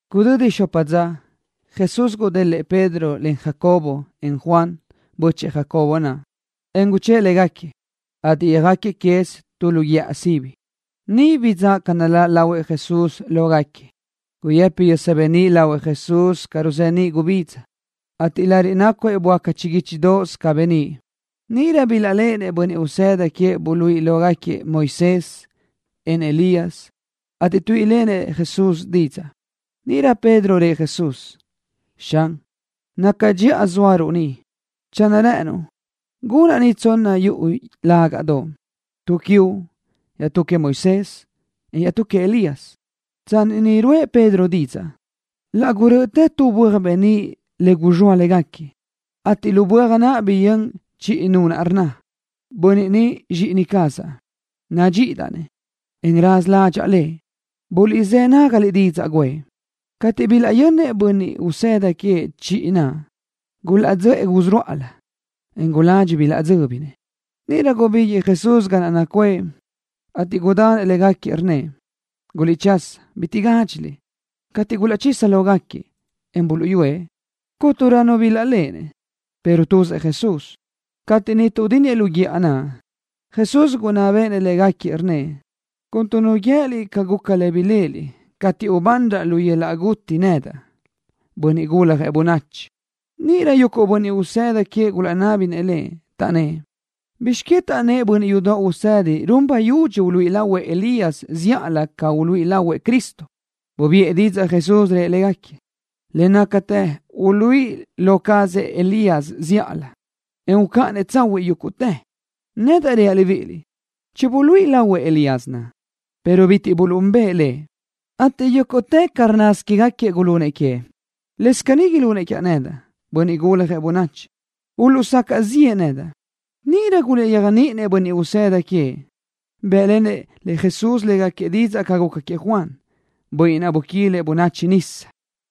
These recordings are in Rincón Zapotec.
Gudödi xopa dza, Jesús gudélëʼë Pedro len Jacobo, en Juan, bö́chëʼë Jacobo naʼ, en guchë́ʼë légaquiëʼ, ateʼ yöjáquiëʼ quez tu lu guíʼa sibi. Niʼ bidzáʼ ca naláʼ lahuëʼ Jesús lógaquiëʼ. Guyëpi yösa beníʼ lahuëʼ Jesús ca ruzeníʼ gubidza, ateʼ lariʼ nácuëʼ böáca chiguíchidoʼos ca beníʼ. Níʼirö bilaʼléʼenëʼ bönniʼ usëda queëʼ buluíʼi lógaquiëʼ Moisés, en Elías, ateʼ tuíʼilenëʼ Jesús didzaʼ. Níʼirö Pedro rëʼ Jesús: —Xan, naca dxiʼa zóaruʼ ni. Channö rë́ʼënuʼ, gunaʼ ni tsonna yuʼu lágaʼdoʼ, tu quiuʼ, iaʼtú queëʼ Moisés, en iaʼtú queëʼ Elías. Tsanni niʼ ruʼë Pedro didzaʼ ni, laʼ gurö́ʼötë tu böaj beníʼ le guzxóa légaquiëʼ, ateʼ lu böaj naʼ biyö́n chiʼi nu rnna: —Bönniʼ ni Zxíʼini cazaʼ. Nadxíʼidaʼ-nëʼ, en raza ládxaʼa Lëʼ. Buliʼzë́ nágaliʼ didzaʼ guʼë. Cateʼ bilaʼyönnëʼ bönniʼ usëda queëʼ chiʼi naʼ, gulaʼdzöʼë gusurúʼalö, en guladxi bilaʼdzö́binëʼ. Níʼirö gubíguiʼë Jesús ga naʼ nacuʼë, ateʼ gudanëʼ légaquiëʼ, rnnëʼ: —Guliʼchasa. Bitiʼ gádxiliʼ. Cateʼ gulaʼchisa lógaquiëʼ, en buluʼyúëʼ, cúnturö nu bilaʼléʼenëʼ, pero tuzëʼ Jesús. Cateʼ niʼ tuʼdínniëʼ lu guíʼa naʼ, Jesús gunná béʼenëʼ légaquiëʼ, rnnëʼ: —Cuntu nu guië́liʼ ca guca lë ni biléʼeliʼ cateʼ ubanraʼ lu yöl-laʼ guti nedaʼ, Bönniʼ Guljëʼ Bönachi. Níʼirö yuguʼ bönniʼ usëda queëʼ gulaʼnábinëʼ Lëʼ, taʼnnë́ʼ: —¿Bizx que taʼnnë́ʼ bönniʼ yudoʼ usëdi run bayudxi uluíʼi lahuëʼ Elías zíʼalö ca uluíʼi lahuëʼ Cristo? Bubiʼë didzaʼ Jesús, rëʼ légaquiëʼ: —Le nácatë uluíʼi lo cazëʼ zíʼalö Elías, en ucáʼanëʼ tsahuiʼ yúguʼtë. Nedaʼ reaʼ libíʼiliʼ: “Chibuluíʼi lahuëʼ Elías naʼ, pero bitiʼ buluʼúnbëʼë lëʼ, ateʼ yúguʼtë ca rnnasö quégaquiëʼ gulunëʼ queëʼ.” Lëscaʼ caní ilunëʼ quiaʼ nedaʼ, Bönniʼ Guljëʼ Bönachi, uluʼsacaʼ ziʼë nedaʼ. Níʼirö gulaʼyéajniʼinëʼ bönniʼ usëda queëʼ, bë́ʼlenëʼ Jesús légaquiëʼ didzaʼ ca guca queëʼ Juan, bönniʼ naʼ buquilëʼ bönachi nisa.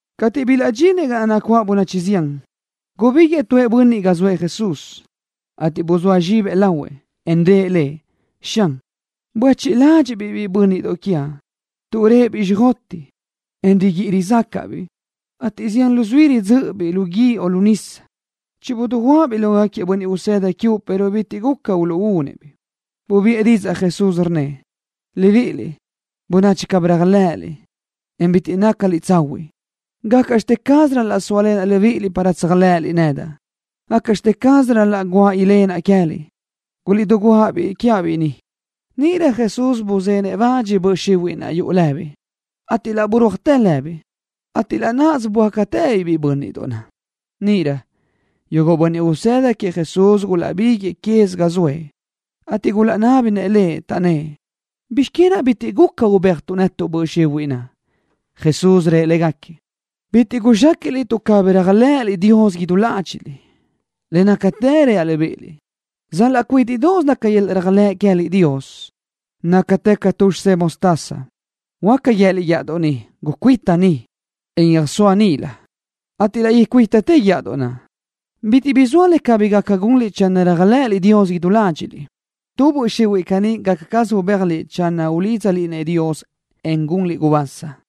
Cateʼ bilaʼdxinëʼ ga naʼ nacuáʼ bönachi zián, gubíguiʼë tu bönniʼ ga zoëʼ Jesús, ateʼ buzóa zxibëʼ lahuëʼ Lëʼ, en rëʼ Lëʼ: —Xan, buéchiʼ ladxiʼ-biʼ biʼi bö́nniʼdoʼ quiaʼ, tuʼ réʼebiʼ xjoteʼ, en riguíʼi rizácaʼdaʼabiʼ, ateʼ zián luzuí ridzö́ʼöbiʼ lu guíʼ o lu nisa. Chidiguáʼa-biʼ lógaquiëʼ bönniʼ usëda quiuʼ pero bitiʼ guca uluʼúnëʼ-biʼ. Bubiʼë didzaʼ Jesús, rnnëʼ: —Libiʼiliʼ, bönachi cabí réajlëʼëliʼ, en bitiʼ nácaliʼ tsahuiʼ. ¿Gácaʼxte caz ral-laʼ sóalenaʼ libíʼiliʼ para tséajlëʼëliʼ nedaʼ? ¿Gácaʼxte caz ral-laʼ guáʼ ilenaʼ queë́liʼ? Guliʼdiguáʼ-biʼ quiaʼ ni. Níʼirö Jesús buzenëʼ le bach böʼ xihuiʼ naʼ yuʼu lëbiʼ, ateʼ laʼ burúajtë lëbiʼ, ateʼ laʼ náʼasö böácatëbiʼ biʼi bö́nniʼdoʼ naʼ. Níʼirö, yuguʼ bönniʼ usëda queëʼ Jesús gulaʼbiguëʼë quez ga zoëʼ, ateʼ gulaʼnábinëʼ Lëʼ, taʼnnë́ʼ: —¿Bizx que naʼ bitiʼ guca ubéajtuʼ netuʼ böʼ xihuiʼ naʼ? Jesús rëʼ légaquiëʼ: —Bitiʼ guzxéquiʼliʼ tuʼ cabí réajlëʼëliʼ Dios idú ládxiʼliʼ. Le nácatë reaʼ libíʼiliʼ, sal-laʼ cuídiʼsö naca yöl-laʼ réajlëʼ queë́liʼ Dios, nácatë ca tu xisedoʼ mostaza, huáca guië́liʼ guíʼadoʼ ni: “Gucuíta ni, en yöjsóa níʼilö”, ateʼ laʼ icuítatë guíʼadoʼ naʼ. Bitiʼ bi zoa le cabí gaca gunliʼ channö réajlëʼëliʼ Dios idú ládxiʼliʼ. Tu böʼ xihuiʼ caní gácasö ubéajliʼ channö ulídzaliʼ-nëʼ Dios, en gunliʼ gubasa.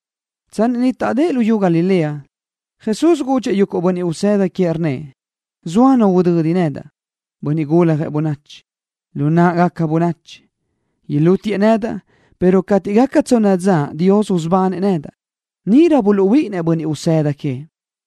Tsanni niʼ taʼdë́ʼ luyú Galilea, Jesús gudxëʼ yuguʼ bönniʼ usëda queëʼ, rnnëʼ: —Zoa nu udödi nedaʼ, Bönniʼ Guljëʼ Bönachi, lu náʼagaca bönachi. Ilútiëʼ nedaʼ, pero cateʼ gaca tsonna dza Dios usubanëʼ nedaʼ. Níʼirö buluʼhuíʼinnëʼ bönniʼ usëda queëʼ.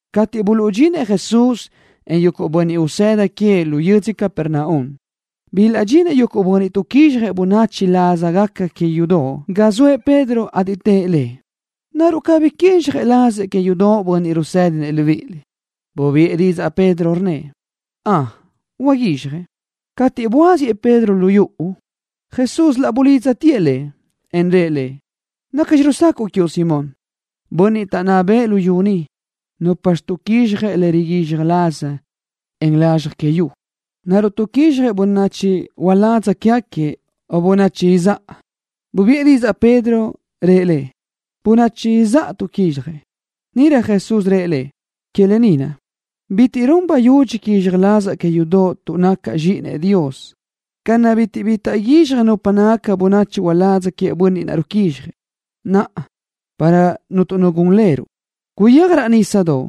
Cateʼ buluʼdxinëʼ Jesús, en yuguʼ bönniʼ usëda queëʼ lu yödzö Capernaum, bilaʼdxinëʼ yuguʼ bönniʼ tuʼquizxjëʼ bönachi lázagaca que yudoʼ ga zoëʼ Pedro, ateʼ tëʼ lëʼ: —¿Naruʼ cabí quizxaj lazëʼ que yudoʼ bönniʼ rusédinëʼ libíʼiliʼ? Bubiʼë didzaʼ Pedro, rnnëʼ: —Ön, huaguizxjëʼ. Cateʼ buáziëʼ Pedro lu yuʼu, Jesús laʼ bulidztëʼ lëʼ, en rëʼ lëʼ: —¿Nacxi rusacaʼ quiuʼ, Simón? Bönniʼ taʼnná bëʼë luyú ni, ¿nupxi tuʼquizxjëʼ le riguizxaj laz, en lazxaj que yu? ¿Naruʼ tuʼquizxjëʼ bönachi uládz quégaquiëʼ o bönachi izáʼa? Bubiʼë didzaʼ Pedro, rëʼ Lëʼ: —Bönachi izáʼa tuʼquizxjëʼ. Níʼirö Jesús rëʼ lëʼ: —Que lë ni naʼ, bitiʼ run bayudxi quizxaj lazaʼ que yudoʼ tuʼ nacaʼ Zxíʼinëʼ Dios ca naʼ bitiʼ bi taʼguízxaj nupa nácagaca bönachi uládz queëʼ bönniʼ naʼ ruquízxjëʼ. Naʼa, para cuntu nu gun leruʼ, guyéaj raʼ nísadoʼ,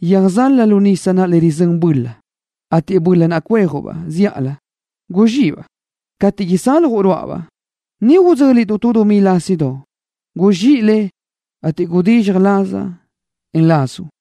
yöjzalaj lu nisa le rizö́ninuʼ-baʼ böla, ateʼ böla cuejuʼ-baʼ zíʼalö, guzxíʼi-baʼ. Cateʼ isaljuʼ ruáʼabaʼ, niʼ idzö́linuʼ tu dumí lásidoʼ. Guzxíʼi le, ateʼ gudizxaj lazaʼ, en lazuʼ.